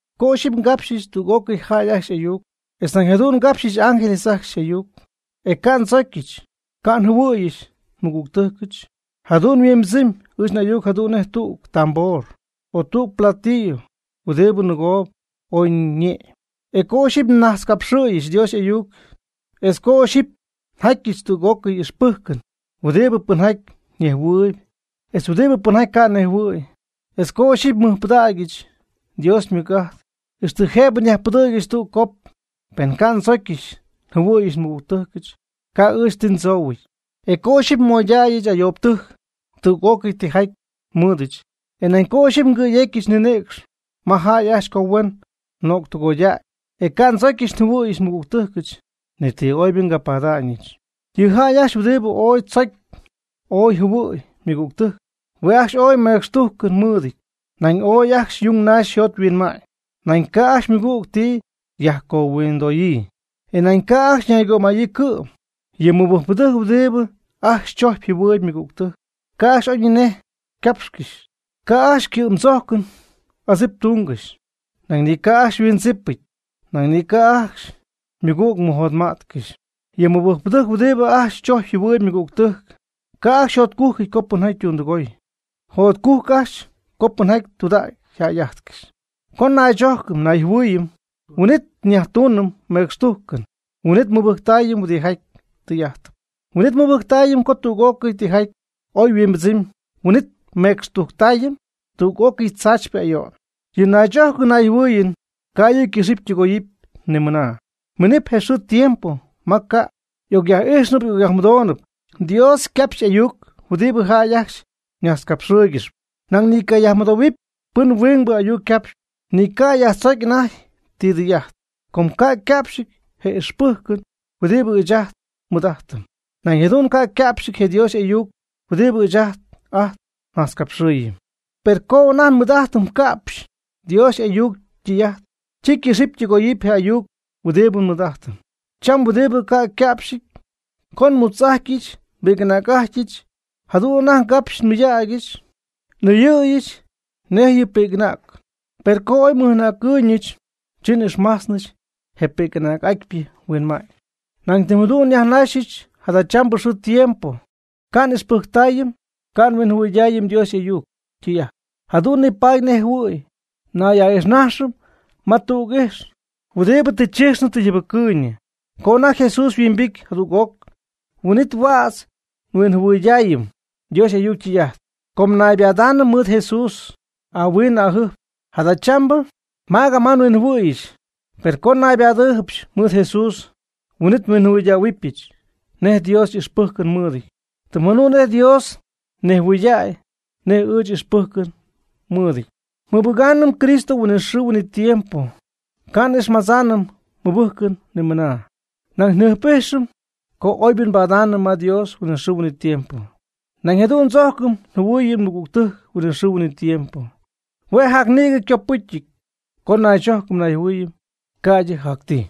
Co ixyipy ngapxyɨch tüg'ócɨy jäy ajcxy y'ayuc, etz nañ jadu'n ngapxɨch ángeles ajcxy y'ayuc, e ca' ndzocyɨch ca' njɨhuɨ̈yɨch nmɨgügtɨjcɨch, jadu'n yhuimbɨdzɨmy ɨɨch n'ayuc jadu'n nej tüg tambor o tüg platillo huɨdibɨ nɨgoob ooy ñe'my. E co ixyipy najtzcapxɨ̈yɨch Dios y'ayuc, etz co ixyipy njatyɨch tüg'ócɨy ixpɨjcɨn huɨdibɨ pɨnjaty nejhuɨ̈y etz huɨdibɨ pɨnjaty ca' nejhuɨ̈y, etz co ixyipy nmɨjpɨdägyɨch Dios ymɨc'ajt, ixtɨ jëbɨ nyajpɨdɨ̈gyɨch tüg cop, pen ca' ndzocyɨch njɨhuɨ̈yɨch nmɨgügtɨjcɨch, ca' ɨɨch ti ndzoohuɨty. E co ixyipy nmoydayɨch ayoobɨtɨjc tüg'ócɨy tijaty nmɨɨdɨch, e nañ co ixyipy ngɨ̈yecyɨch nninɨ̈cx ma jäy ajcxy co huen nöctɨgoydäy, e ca' ndzocyɨch njɨhuɨ̈yɨch nmɨgügtɨjcɨch, ni ti oybɨ ca' nbada'ñɨch. Yɨ jäy ajcxy huɨdibɨ ooy tzocy ooy jɨhuɨ̈y ymɨgügtɨjc, hue' ajcxy ooy mecxtujcɨn mɨɨdɨty, nañ ooy ajcxy yung naxy yjot yhuinma'ñ. Nañ ca' ajcxy ymɨgüg ti yajcohuindoyii, e nañ ca' ajcxy ñaygömayii cɨ'm. Yɨ mɨbɨjcpɨdɨjc huɨdibɨ ajcxy tzojcp jɨhuɨɨyb ymɨgügtɨjc, ca' ajcxy oyñinej ycapxcɨxy, ca' ajcxy ycɨ'm tzojcɨn adzip tungɨxy, nañ ni ca' ajcxy yhuindzipɨty, nañ ni ca' ajcxy ymɨgüg mɨjotma'tcɨxy. Yɨ mɨbɨjcpɨdɨjc huɨdibɨ ajcxy tzojcp jɨhuɨɨyb ymɨgügtɨjc ca' ajcxy yjotcujcɨty co pɨnjaty ytundɨgooy. Jotcujc ajcxy co pɨnjaty tudägy yjäy'ájtcɨxɨp. Co naychojcɨm nayjɨhuɨɨyɨm, huin'it yajtunɨm mecxtujcɨn, huin'it nmɨbɨjctayɨm huɨdijaty tɨy'ajtɨp, huin'it nmɨbɨjctaayɨm co tüg'ócɨy tijaty oy yhuimbɨdzɨmɨpy, huin'it nmecxtujctayɨm tüg'ócɨy tzaachypɨ ayo'n. Yɨ naychojcɨn nayjɨhuɨɨyɨn ca' yɨ' ycɨxɨpy ytɨgoyɨpy ni mɨna. Minɨp je xɨɨ tiempo ma ca' y'ocyaj'ijxnɨpy y'ocyajmɨdoonɨpy Dios ycapxy y'ayuc huɨdi jäy ajcxy ñajtzcapxɨɨygɨxyp, nañ ni ycayajmɨdoohuɨpy pɨn huingbɨ ayuc capxp, ni ycayajtzocy anajty ti dɨy'ajt. Com ca' yca'pxɨty je ixpɨjcɨn huɨdibɨ ɨɨch ajt nmɨɨd'ajtɨm. Nañ jadu'n ca' yca'pxɨty je Dios y'ayuc huɨdibɨ ɨɨch ajt nnajtzcapxɨɨyɨm. Per co anajty nmɨɨd'ajtɨm ca'pxy Dios y'ayuc ytɨy'ajt, chi ycɨxɨpy ytɨgoyɨpy je ayuc huɨdibɨ nmɨɨd'ajtɨm cham huɨdibɨ ca' yca'pxɨty. Co nmutz'ajtyɨch nbi'c'anäg'ajtyɨch, jadu'n anajty ngapxyɨch nmɨydägyɨch n'ɨyɨ̈yɨch nejtyɨn pi'c'anäcɨn. Per co oy nmɨj'anäcɨɨyñɨch, chi n'ixmajtznɨch je pi'c'anäg'atypɨ huinma'ñ. Nañ tɨm jadu'n nyajnajxɨm jadachambɨ xɨɨ tiempo ca' n'ijxpɨjctaayɨm, ca' nhuinjɨhuɨydaayɨm Dios y'ayuc ytɨy'ajt. Jadu'n nipaady nej jɨhuɨ̈y nay'a'ijxnajxɨm ma tüg ijx, huɨdibɨ tɨ chijxnɨ tɨ yjɨbɨcɨɨyñɨ. Co anajty Jesús yhuimbity jadüg'oc, huin'it huädz nhuinjɨhuɨydaayɨm Dios y'ayuc ytɨy'ajt, com naybadaanɨm mɨɨd Jesús ahuin ajɨjp. Jadachambɨ magama nhuinjɨhuɨɨyɨch. Per co nnaybadɨɨybɨch mɨɨd Jesús, huin'it nhuinjɨhuɨydähuɨbɨch nej Dios y'ixpɨjcɨn mɨɨdɨty, tɨm jadu'n nej Dios nejhuɨydäy nej ɨɨch n'ixpɨjcɨn nmɨɨdɨty. Nmɨbɨgaanɨm Cristo huinɨxɨɨ huinɨtiempo, ca' n'ixmadzaanɨm nmɨbɨjcɨn ni mɨna. Nañ njɨjp'ijxɨm co oybɨ nbadaanɨm ma Dios huinɨxɨɨ huinɨtiempo. Nañ jadu'n ndzojcɨm njɨhuɨɨyɨm mɨgügtɨjc huinɨxɨɨ huinɨtiempo. Hue' jac nïgɨ copɨcyɨp co naychojcɨm nayjɨhuɨɨyɨm ca'ydɨ jac ti.